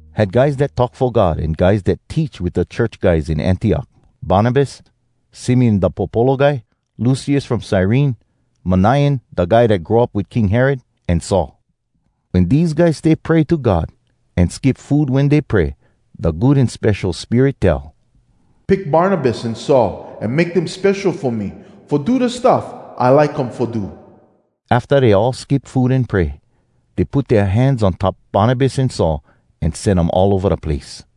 Had guys dat talk fo God an guys dat teach wit da church guys in Antiok: Barnabas, Simeon da popolo guy, Lucius from Cyrene, Manaen da guy dat grow up wit King Herod, an Saul. Wen dese guys stay pray to God, an skip food wen dey pray, da Good An Spesho Spirit tell, “Pick Barnabas an Saul, an make dem spesho fo me, fo do da stuff I like um fo do.” Afta dey all skip food an pray, dey put dea hands on top Barnabas an Saul, an sen um all ova da place.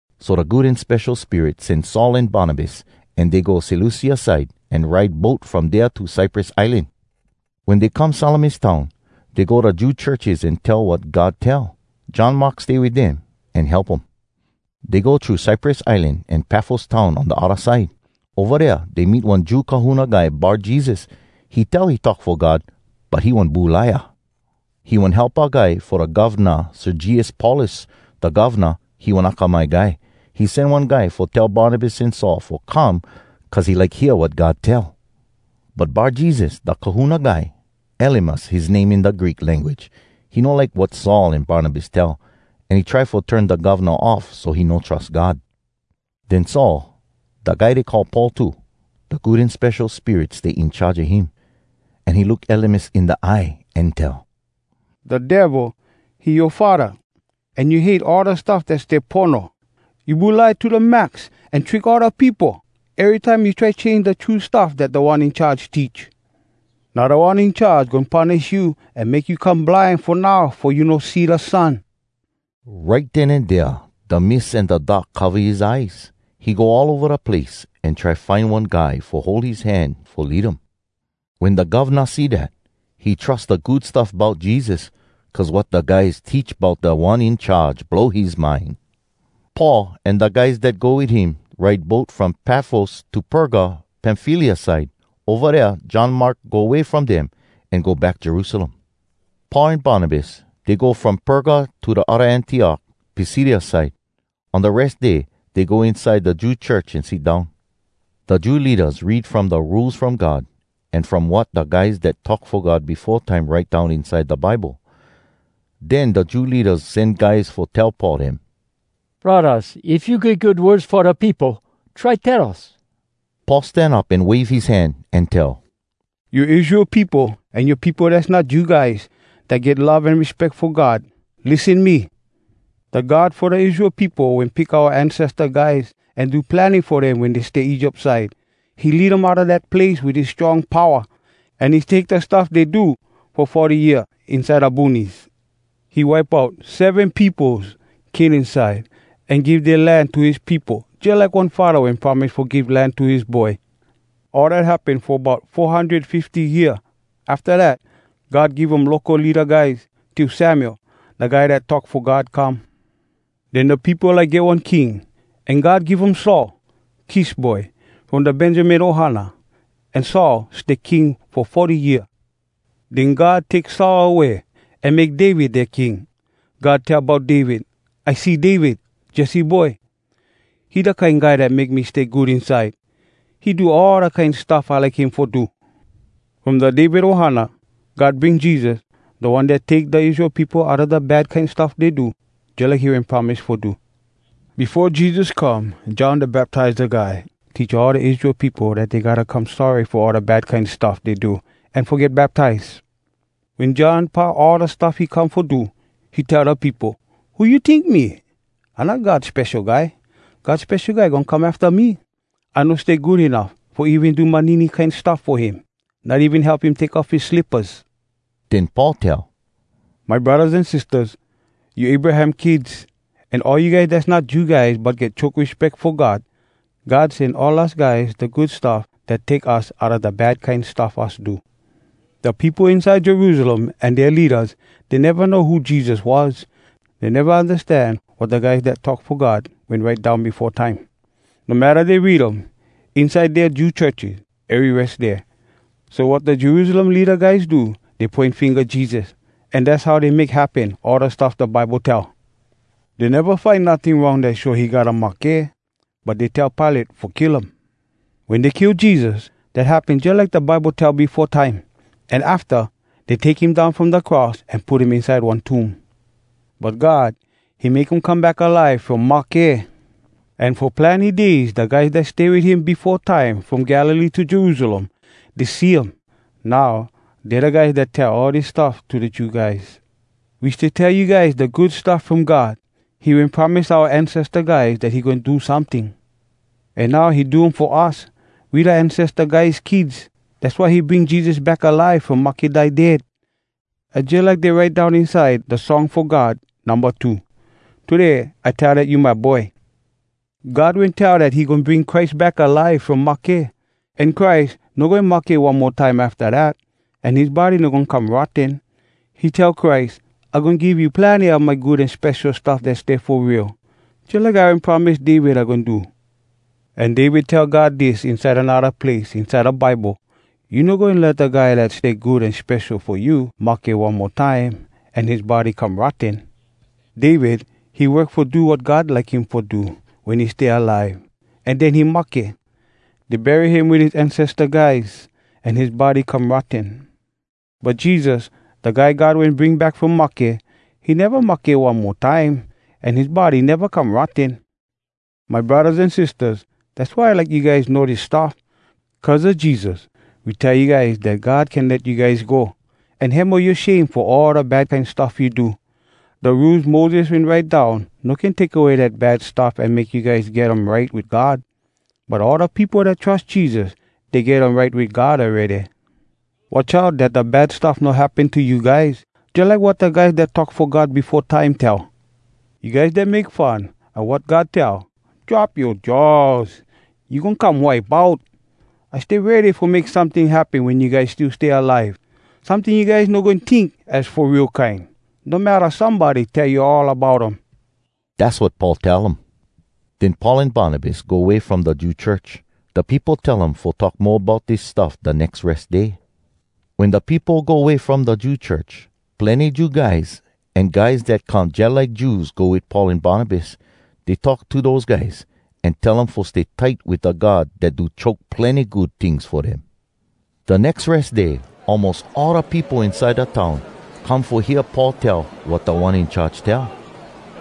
So da Good An Spesho Spirit sen Saul an Barnabas, an dey go Seleucia side, an ride boat from dea to Cyprus Islan. Wen dey come Salamis town, dey go da Jew churches an tell wat God tell. John Mark stay wit dem, an help um. Dey go thru Cyprus Islan to Pafos town on da odda side. Ova dea dey meet one Jew kahuna guy Bar-Jesus. He tell he talk fo God, but he one bulaia. He one helpa guy fo da govna, Sergius Paulus. Da govna, he one akamai guy. He sen one guy fo tell Barnabas an Saul fo come cuz he like hear wat God tell. But Bar-Jesus, da kahuna guy, “Elymas” his name in da Greek language, he no like wat Saul an Barnabas tell, an he try fo turn da govna off so he no trus God. Den Saul, da guy dey call Paul too, da Good An Spesho Spirit stay in charge a him. An he look Elymas in da eye, an tell, “Da Devil, he yoa faddah, an you hate all da stuff dat stay pono! You bulai to da max, an trick all da peopo! Erytime you try change da true stuff dat Da One In Charge teach! Now Da One In Charge goin punish you an make you come blind fo now fo you no see da sun!” Right den an dea da mist an da dark cova his eyes. He go all ova da place, an try find one guy fo hold his hand fo lead him. Wen da govna see dat, he trus da Good Stuff Bout Jesus, cuz wat da guys teach bout Da One In Charge blow his mind. Paul an da guys dat go wit him ride boat from Pafos to Perga, Pamfylia side. Ova dea John Mark go way from dem, an go back Jerusalem. Paul an Barnabas, dey go from Perga to da odda Antiok, Pisidia side. On da Res Day dey go inside da Jew church an sit down. Da Jew leadas read from da Rules From God, an from wat da guys dat talk fo God befo time write down inside da Bible. Den da Jew leadas sen guys fo tell Paul dem, “Braddahs, if you get good words fo da peopo, try tell us.” Paul stan up an wave his hand, an tell, “You Israel peopo an you peopo dass not Jew guys dat get love an respeck fo God, lissen me! Da God fo da Israel peopo wen pick oua ancesta guys an do plenny fo dem wen dey stay Egypt side. He lead um outa dat place wit his strong powa, an he take da stuff dey do fo forty year inside da boonies. He wipe out seven peopos Canaan side, an give dea land to his peopo jalike one faddah wen promise fo give land to his boy. All dat happen fo bout four hundred fifty year. “Afta dat, God give um local leada guys, till Samuel, da guy dat talk fo God come. Den da peopo like get one king, an God give um Saul, Kish boy, from da Benjamin ohana. An Saul stay king fo forty year. Den God take Saul away, an make David dea king. God tell bout David, ‘I see David, Jesse boy. He da kine guy dat make me stay good inside. He do all da kine stuff I like him fo do.’ “From da David ohana, God bring Jesus, da One dat take da Israel peopo outa da bad kine stuff dey do, jalike he wen promise fo do. Befo Jesus come, John Da Baptiza Guy teach all da Israel peopo dat dey gotta come sorry fo all da bad kine stuff dey do, an fo get baptize. Wen John pau all da stuff he come fo do, he tell da peopo, ‘Who you tink me? I not God Spesho Guy. God Spesho Guy goin come afta me. I no stay good enuff fo even do manini kine stuff fo him, not even help him take off his slippas.’” Den Paul tell, “My braddahs an sistahs, you Abraham kids, an all you guys dass not Jew guys but get choke respeck fo God, God sen all us guys da Good Stuff dat take us outa da bad kine stuff us do. Da peopo inside Jerusalem an dea leadas, dey neva know who Jesus was. Dey neva undastan wat da guys dat talk fo God wen write down befo time, no matta dey read um inside dea Jew churches ery Res Day. So wat da Jerusalem leada guys do, dey poin finga Jesus. An dass how dey make happen all da stuff da Bible tell. Dey neva find notting wrong dat show he gotta mahke, but dey tell Pilate fo kill um. Wen dey kill Jesus, dat happen jalike da Bible tell befo time. An afta, dey take him down from da cross an put him inside one tomb. But God, he make um come back alive from mahke! An fo plenny days da guys dat stay wit him befo time from Galilee to Jerusalem, dey see um. Now, dey da guys dat tell all dis stuff to da Jew guys. “We stay tell you guys da Good Stuff From God. He wen promise oua ancesta guys dat he goin do someting. An now he do um fo us, we da ancesta guys kids. Dass why he bring Jesus back alive from mahke die dead! Az jalike dey write down inside da Song Fo God Numba Two: “‘Today I tell Dat you my Boy!’ “God wen tell dat he goin bring Christ back alive from mahke, an Christ no goin mahke one mo time afta dat, an his body no goin come rotten. He tell Christ, “‘I goin give you plenny a my good an spesho stuff dat stay fo real, Jalike I wen promise David I goin do.’ “An David tell God dis inside anodda place inside da Bible, “‘You no goin let da guy dat stay good an spesho fo you mahke one mo time An his body come rotten.’ “David, he work fo do wat God like him fo do wen he stay alive, an den he mahke. Dey bury him wit his ancesta guys, an his body come rotten. But Jesus, da Guy God wen bring back from mahke, he neva mahke one mo time an his body neva come rotten. My braddahs an sistahs, dass why I like you guys know dis stuff. Cuz a Jesus, we tell you guys dat God can let you guys go, an hemo yoa shame fo all da bad kine stuff you do. Da Rules Moses wen write down no can take away dat bad stuff an make you guys get um right wit God. But all da peopo dat trus Jesus, dey get um right wit God awready. Watch out dat da bad stuff no happen to you guys, jalike wat da guys dat talk fo God befo time tell: “‘You guys dat make fun a wat God tell, Drop yoa jaws! You goin come wipe out! I stay ready fo make someting happen Wen you guys still stay alive. Someting you guys no goin tink Az fo real kine, No matta somebody Tell you all about um.’” Dass wat Paul tell um. Den Paul an Barnabas go way from da Jew church. Da peopo tell um fo talk mo bout dis stuff da nex Res Day. Wen da peopo go way from da Jew church, plenny Jew guys an guys dat come jalike Jews go wit Paul an Barnabas. Dey talk to dose guys, an tell um fo stay tight wit da God dat do choke plenny good tings fo dem. Da nex Res Day almos all da peopo inside da town come fo hear Paul tell wat Da One In Charge tell.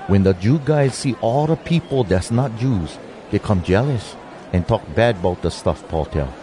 Wen da Jew guys see all da peopo dass not Jews, dey come jealous, an talk bad bout da stuff Paul tell.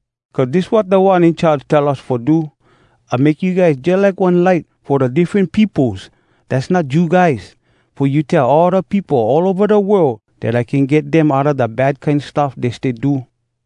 Cuz dis wat Da One In Charge tell us fo do, “‘I make you guys jalike one light Fo da diffren peopos dass not Jew guys, Fo you tell all da peopo all ova da world Dat I can get dem outa da bad kine stuff dey stay do.’”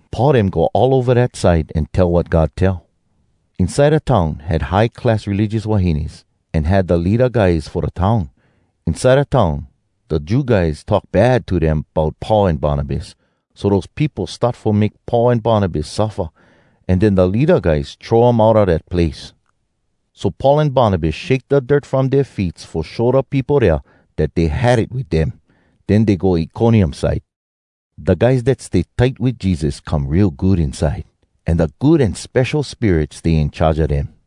Paul dem go all ova dat side an tell wat God tell. Inside da town had high class religious wahines an had da leada guys fo da town. Inside da town, da Jew guys talk bad to dem bout Paul an Barnabas, so dose peopo start fo make Paul an Barnabas suffa, an den da leada guys throw um outa dat place. So Paul an Barnabas shake da dirt from dea feets fo show da peopo dea dat dey had it wit dem. Den dey go Iconium side. Da guys dat stay tight wit Jesus come real good inside, an da Good An Spesho Spirit stay in charge a dem.